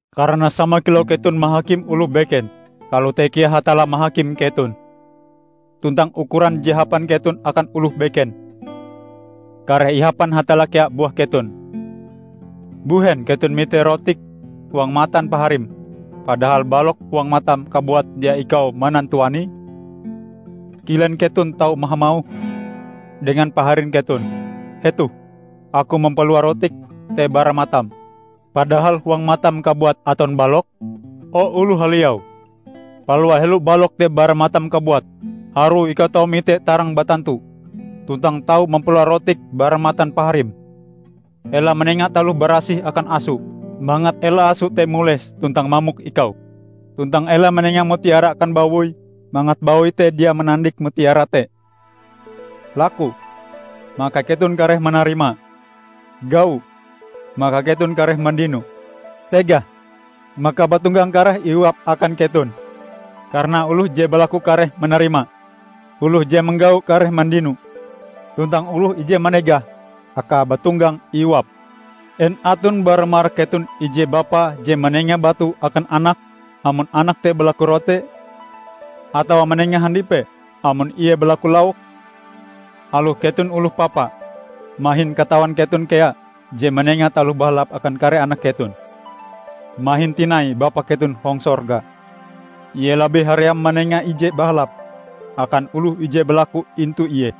Karana sama kilau keton mahakim oloh beken, kalote kea Hatalla mahakim keton. Tuntang ukuran je hapan keton akan oloh beken, kareh ihapan Hatalla kea buah keton. Mbuhen keton mite rotik huang matan paharim, padahal balok huang matam kabuat dia ikau manantuanie? Kilen keton tau hamauh dengan paharin keton, 'Hetoh aku mampalua rotik te bara matam,' padahal huang matam kabuat aton balok? O, oloh haliau! Palua helo balok te bara matam kabuat, harue ikau tau mite tarang batantu, tuntang tau mampalua rotik bara matan paharim. Ela manenga taloh barasih akan aso, mangat ela aso te mules tuntang mamok ikau. Tuntang ela manenga mutiara akan bawoi, mangat bawoi te dia manandik mutiara te." "Laku, maka keton kareh manarima. Gau, maka keton kareh mandino. Tegah, maka bauntonggang kareh iuap akan keton. Karana oloh je balaku kareh manarima; oloh je manggau kareh mandino; tuntang oloh ije manegah, akae bauntonggang iuap. En aton bara marak keton ije bapa je manenga batu akan anake amon anake te balaku rote? Atawa manenga handipe amon ie balaku lauk? Aloh keton oloh papa, mahin katawan keton kea je manenga taloh bahalap akan kare anak keton. Mahin tinai Bapa keton hong sorga! Ie labih haream manenga ije bahalap akan oloh ije balaku intu Ie.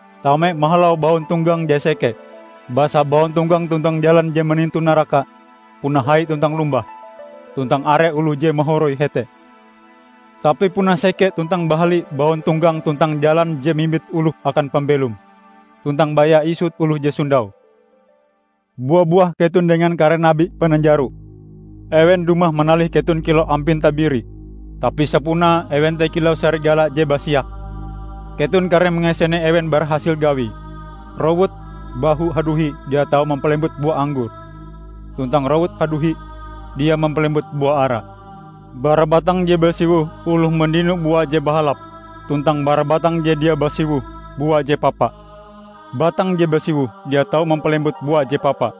"Tame mahalau bauntonggang je seke, basa bauntonggang tuntang jalan je manintu naraka puna hai tuntang lombah, tuntang are oloh je mahoroi hete. Tapi puna seke tuntang bahali bauntonggang tuntang jalan je mimbit oloh akan pambelom. Tuntang baya isut oloh je sondaue." "Bua-buah keton dengan kare nabi pananjaro. Ewen dumah manalih keton kilau ampin tabiri, tapi sapunae ewen te kilau sarigala je basiak. Keton kareh mangasene ewen bara hasil gawie. Rowut bahu haduhi dia tau mampalembut bua anggor, tuntang rowut haduhi dia mampalembut bua ara. Bara batang je basiwoh oloh mandino bua je bahalap, tuntang bara batang je dia basiwoh, bua je papa. Batang je basiwoh dia tau mampalembut bua je papa,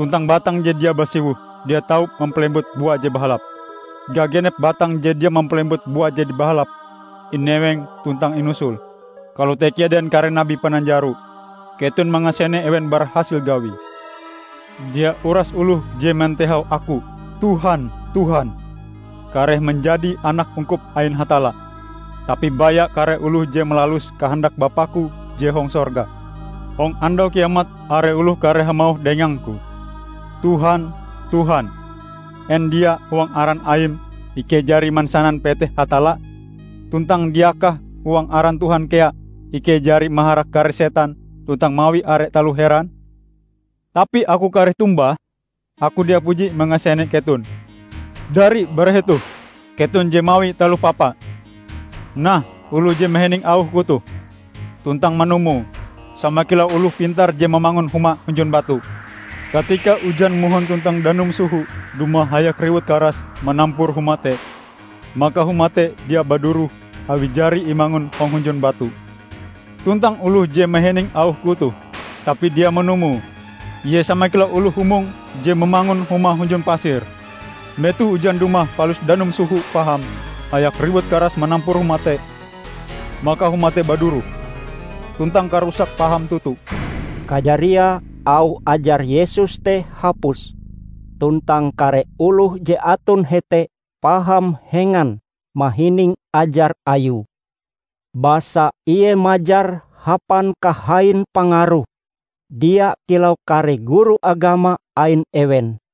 tuntang batang je dia basiwoh dia tau mampalembut bua je bahalap. Gagenep batang je dia mampalembut bua je bahalap, ineweng tuntang inusul. Kalote kea dengan kare nabi pananjaro. Keton mangasene ewen bara hasil gawie." "Dia uras oloh je mantehau Aku 'Tuhan, Tuhan,' kareh manjadi anak ungkup ain Hatalla, tapi baya kare oloh je malalus kahandak Bapa-Ku je hong sorga. Hong Andau Kiamat are oloh kareh hamauh dengang-Ku, 'Tuhan, Tuhan, en dia huang aran Aim ikei jari mansanan peteh Hatalla? Tuntang diakah huang aran Tuhan kea ikei jari maharak kare setan tuntang mawi are taloh heran?' Tapi Aku kareh tombah, 'Aku dia puji mangasene keton! Dari bara hetoh, keton je mawi taloh papa!' " "Nah oloh je mahining auh-Ku toh, tuntang manumoe, sama kilau oloh pintar je mamangun humae hunjun batu. Katika ujan mohon tuntang danum soho dumah hayak riwut karas manampur huma te, maka huma te dia baduroh awi jari imangun hong hunjun batu. Tuntang oloh je mahining auh-Ku toh, tapi dia manumoe, ie sama kilau oloh humong je mamangun humae hunjun pasir. Metoh ujan dumah palus danum soho paham hayak riwut karas manampur huma te, maka huma te baduroh. Tuntang karusake paham toto!" Kajariae auh ajar Yesus te hapus, tuntang kare oloh je aton hete paham hengan mahining ajar Ayue. Basa Ie majar hapan kahain pangaruh, dia kilau kare guru agama ain ewen.